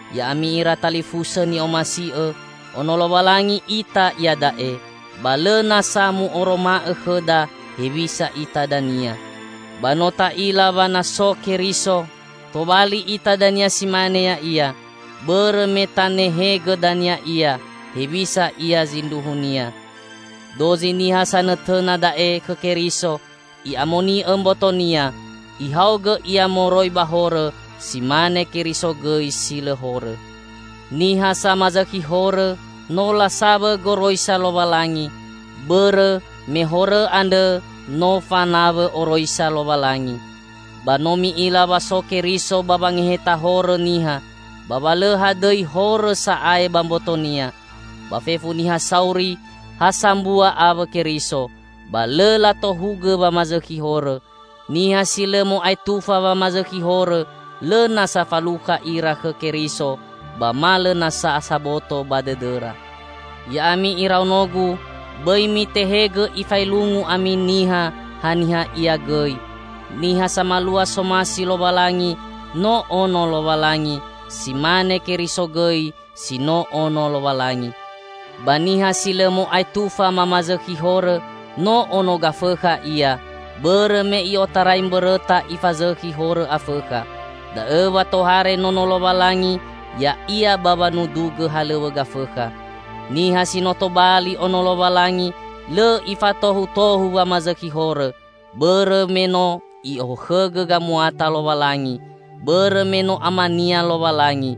Ya'ami ira talifusõ ni'omasi'õ! Ono Lowalangi ita iada'e, ba lõ nasa mu'oroma'õ khõda, hewisa ita dania. Ba no ta'ila wa na so Keriso, tobali ita dania si mane Ya'ia, bõrõ me tanehegõ dania Ia, hewisa Ia zindruhunia. Dozi niha sanõtõna da'e khõ Keriso, i'amoni'õ mbotonia, ihaogõ ia moroi ba horõ si mane Keriso gõi si lõ horõ. Niha samazõkhi horõ, no lasawõ goroisa Lowalangi; bõrõ me horõ andrõ no fanawõ oroisa Lowalangi. Ba no mi'ila wa so Keriso ba wangeheta horõ niha, ba wa lõ hadõi horõ sa'ae ba mboto-Nia. Ba fefu niha sauri ha sambua awõ Keriso, ba lõ latohugõ wamazõkhi horõ. Niha si lõ mo'aetufa wamazõkhi horõ, lõ nasa falukha ira khõ Keriso ba ma lõ nasa saboto ba dõdõra. Ya'ami iraonogu, bõi mitehegõ ifaelungu ami niha, haniha ia gõi. Niha samalua somasi Lowalangi, no ono Lowalangi, si mane Keriso gõi si no Ono Lowalangi. Ba niha si lõ mo'aetufa mamazõkhi horõ, no ono Gafõkha ia, bõrõ me i'otarai mbõrõta ifazõkhi horõ Afõkha. Da'õ wa tohare Nono Lowalangi ya'ia ba wanudugõ halõw̃õ Gafõkha. Niha si no tobali Ono Lowalangi, lõ ifatohutohu wamazõkhi horõ, bõrõ me no i'okhõgõ gamuata Lowalangi. Bõrõ me no Amania Lowalangi,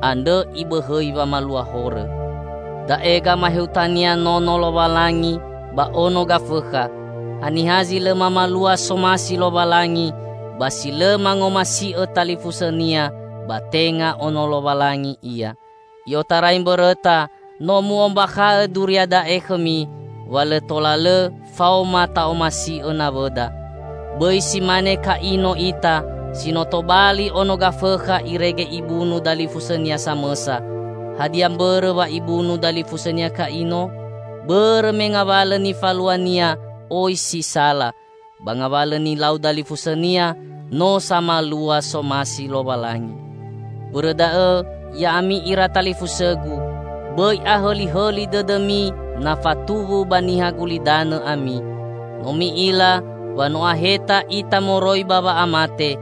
andrõ ibõhõi wamalua horõ. Da'e gamaehutania Nono Lowalangi ba ono Gafõkha: Haniha zi lõ mamalua somasi Lowalangi, ba si lõ mangomasi'õ talifusõnia, ba tenga Ono Lowalangi ia. I'otarai mbõrõta no mu'ombakha'õ duria da'e khõmi: Wa lõ tola lõ faoma ta'omasi'õ nawõda. Bõi si mane Ka'ino ita, si no tobali ono Gafõkha irege ibunu dalifusõnia samõsa. Hadia mbõrõ wa ibunu dalifusõnia Ka'ino? Bõrõ me ngawalõ nifaluania oi si sala, ba ngawalõ nilau dalifusõnia, no samalua somasi Lowalangi. Bõrõ da'õ ya'ami ira talifusõgu, bõi ahõlihõli dõdõmi na fatuwu ba niha gulidanõ ami. No mi'ila wa no aheta ita moroi ba wa'amate,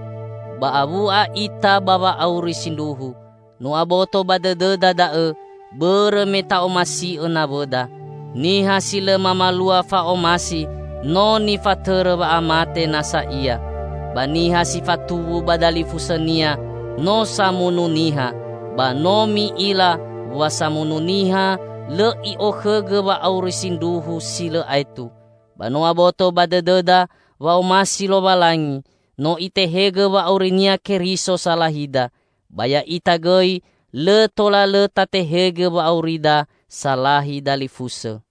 ba awu'a ita ba wa'auri sindruhu. No aboto ba dõdõda da'õ, bõrõ me ta'omasi'õ nawõda. Niha si lõ mamalua fa'omasi, no nifatõrõ wa'amate nasa ia. Ba niha si fatuwu ba dalifusõnia no samunu niha, ba no mi'ila wa samunu niha lõ i'okhõgõ wa'auri sindruhu, si lõ aetu. Ba no aboto ba dõdõda wa'omasi Lowalangi: No Itehegõ wa'auri-Nia Keriso salahida. Ba ya'ita gõi lõ tola lõ tatehegõ wa'aurida salahi dalifusõ!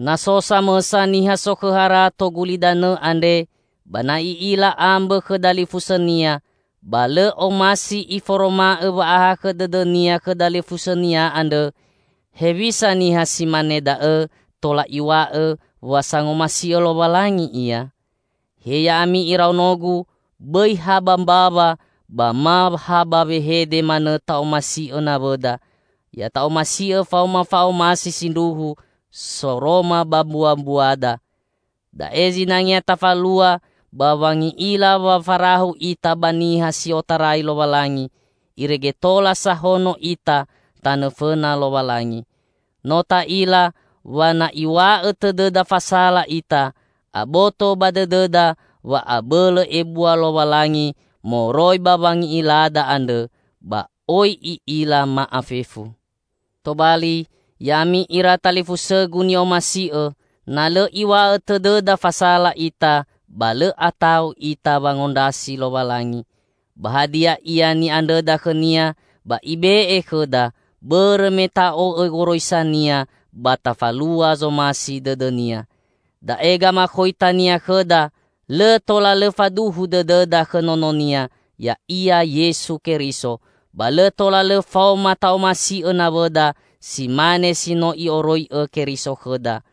Na so samõsa niha sokhõ harato gulidanõ andre, ba na i'ila ambõ khõ dalifusõnia, ba lõ omasi iforoma'õ wa'ahakhõ dõdõnia khõ dalifusõnia andrõ, hewisa niha si mane da'õ tola iw̃a'õ wa sangomasi'õ Lowalangi ia? He ya'ami iraonogu! Bõi ha ba mbawa ba ma ha ba wehede manõ ta'omasi'õ nawõda. Ya ta'omasi'õ faoma fa'omasi sindruhu, soroma ba mbuabuada. Da'e zinangea tafalua ba wangi'ila wa farahu ita ba niha si otarai Lowalangi, irege tola sahono ita tanõ fõna Lowalangi. No ta'ila wa na iw̃a'õ tõdõda fasala ita, aboto ba dõdõda wa abõlõ ebua Lowalangi moroi ba wangi'ilada andrõ, ba oi I'ila ma'afefu. Tobali, ya'ami ira talifusõgu ni'omasi'õ, na lõ iw̃a'õ tõdõda fasala ita, ba lõ ata'u ita wangondrasi Lowalangi. Ba hadia ia ni'andrõda khõ-Nia, ba Ibe'e khõda, bõrõ me ta'o'õ goroisa-Nia ba tafalua zomasi dõdõ-Nia. Da'e gamakhoita-Nia khõda: Lõ tola lõ faduhu dõdõda khõ Nono-Nia, ya'ia Yesu Keriso, ba lõ tola lõ faoma ta'omasi'õ nawõda si mane si no I'oroi'õ Keriso khõda.